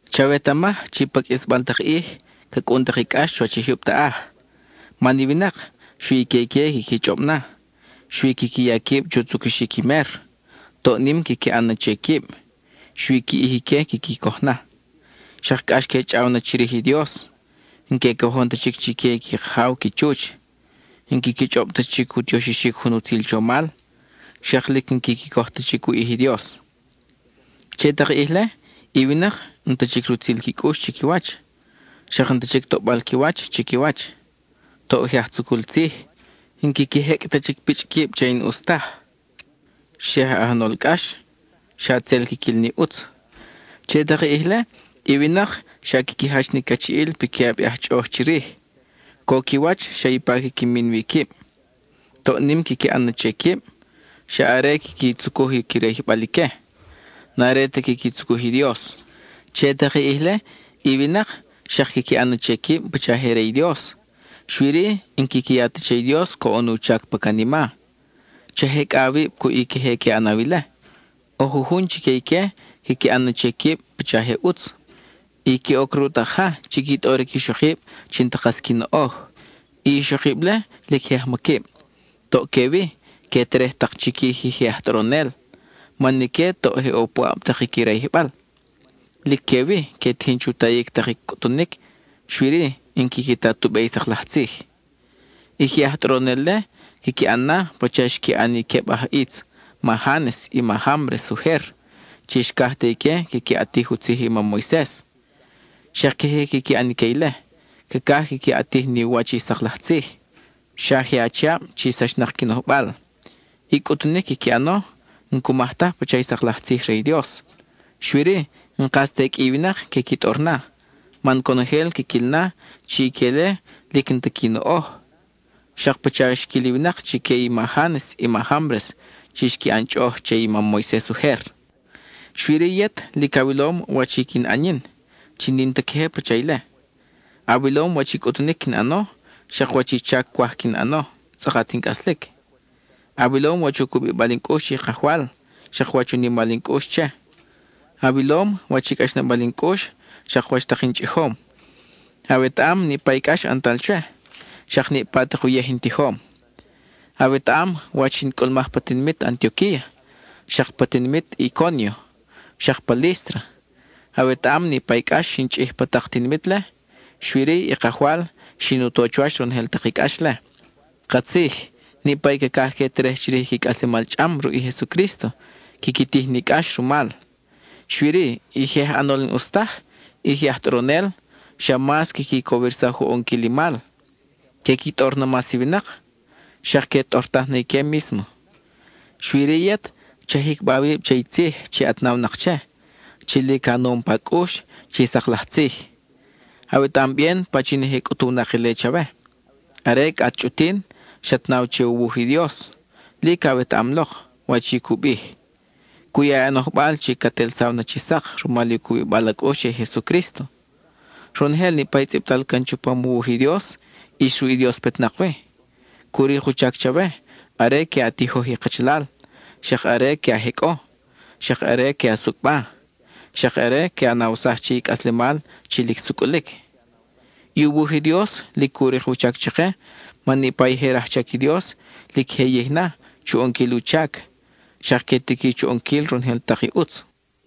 Chawetamaj chi pa qʼuisbal tak ʼij, ca cʼun tak i cʼax chuwach i jyub taʼaj. Man i winak, xui i que ique quiqui chʼob na; xui quiqui ya quib chu tzucuxic i mer, toʼ nim quiqui ʼan na che quib, xui qui ʼij ique quiqui coj na. Xak cʼax que chʼaw na chirij i Dios, n-que cojon ta chic chique i qui kajaw qui chuch, n-quiqui chʼob ta chic u tioxixic jun utzil chomal; xak lic n-quiqui coj ta chic u ʼij i Dios. Che tak i ʼij-le, i winak n-ta chic rutzil qui cʼux chiquiwach, xak n-ta chic toʼbal qui wach chiquiwach; toʼ je aj tzucul tzij, n-quiqui jecʼ ta chic pichʼ quib che i n-ʼus taj; xa je aj ʼanol cʼax, xa tzel quiquil ni ʼutz. Che tak i ʼij-le i winak xak quiqui jach ni cachiʼil piquiʼab i aj chʼoʼoj chirij; co qui wach xa ipa quiqui min wi quib; toʼ nim quiqui ʼan na che quib; xa are quiqui tzucuj qui rayijbal ique, n-are ta quiqui tzucuj i Dios. Che tak i ʼij-le i winak xak quiqui ʼan na che quib pacha je re i Dios, xui-ri, n-quiqui ya ta che i Dios coʼon u chac pa canima. Cha jecʼa awib cuʼ i queje que ʼanaw ile. ʼO jujun chique ique quiqui ʼan na che quib pacha je ʼutz, y que oc ruʼ tak ja chi qui tʼoric ixokib chi n-ta kas qui noʼoj. I ixokib-le lic je ajmaquib, toʼ que wi que terej tak chiquij i je aj tʼoronel, man ique toʼ je ʼo puʼab tak i qui rayijbal. Lic que wi, que tijin chu tayic tak i cʼutunic, xui-ri, n-quiqui ta tu be i sak laj tzij. I je aj tʼoronel-le quiqui ʼan na pacha xqui ʼan i queb aj ʼitz, ma Jánes i ma Jámbres ujer chi xcaj te ique quiqui ʼatij u tzij i mam Moises. Xak queje quiqui ʼan ique ile, cacaj quiqui ʼatij ni u wach i sak laj tzij; xa je achiab chi sachnak qui nojbal; i cʼutunic quiqui ʼano n-cumaj taj pacha i sak laj tzij re i Dios. Xui-ri, n-kas te qʼui i winak que qui tʼor na, man conojel quiquil na chi ique-le lic n-ta qui noʼoj, xak pacha xquil i winak chique i ma Jánes i ma Jámbres chi xqui ʼan chʼoʼoj che i mam Moises ujer. Xui-ri yet, lic awilom wach i quin ʼan yin (chi n-in ta queje pacha ile). Awilom wach i cʼutunic quin ʼano, xak wach i chac cwaj quin ʼano tzʼakat in cʼaslic. Awilom wach u cubibal in cʼux che i Kajwal, xak wach u nimal in cʼux che; awilom wach i cʼaxnabal in cʼux, xak wach tak in chʼijom. Awetaʼam niʼpa i cʼax ʼantal chwe, xak niʼpa uyej in tijom. Awetaʼam wach xin cʼulmaj pa tinimit Antioquía, xak pa tinimit Icónio, xak pa Lístra; awetaʼam niʼpa i cʼax xin chʼij pa tak tinimit-le, xui-ri i Kajwal xin u to chuwach ronojel tak i cʼax-le. Katzij, niʼpa i cacaj que terej chirij i qui cʼaslemal chʼam ruʼ i Jesucrísto, quiqui tij ni cʼax rumal. Xui-ri, i je aj ʼanol n-ʼus taj, i je aj tʼoronel, xa mas quiqui cowirsaj u ʼonquil i mal; que qui tʼor na mas i winak, xak que tʼortaj na ique mísmo. Xui-ri yet, cha jicba awib che i tzij chi at nawnak che, chi lic a nom pa cʼux chi sak laj tzij. Awetaʼam bien pachin je cʼutuwnak ile chawe. Are cʼa at chʼutin xat naw che u wuj i Dios, lic awetaʼam lok wach i cu bij. Cu ya i a nojbal chi cat ʼelsaw na chi sak rumal u cubibal a cʼux che i Jesucrísto. Ronojel niʼpa i tzʼibtal can chupam u wuj i Dios ʼis ruʼ i Dios petnak wi; cu rik u chac chawe are que a tijoj i kachalal, xak are que a jecʼo, xak are que a sucʼba, xak are que a nawsaj che i cʼaslemal chi lic sucʼulic. I u wuj i Dios lic cu rik u chac chake man niʼpa i je rajchac i Dios lic je yij na chu ʼonquil u chac, xak que tiqui chu ʼonquil ronojel tak i ʼutz.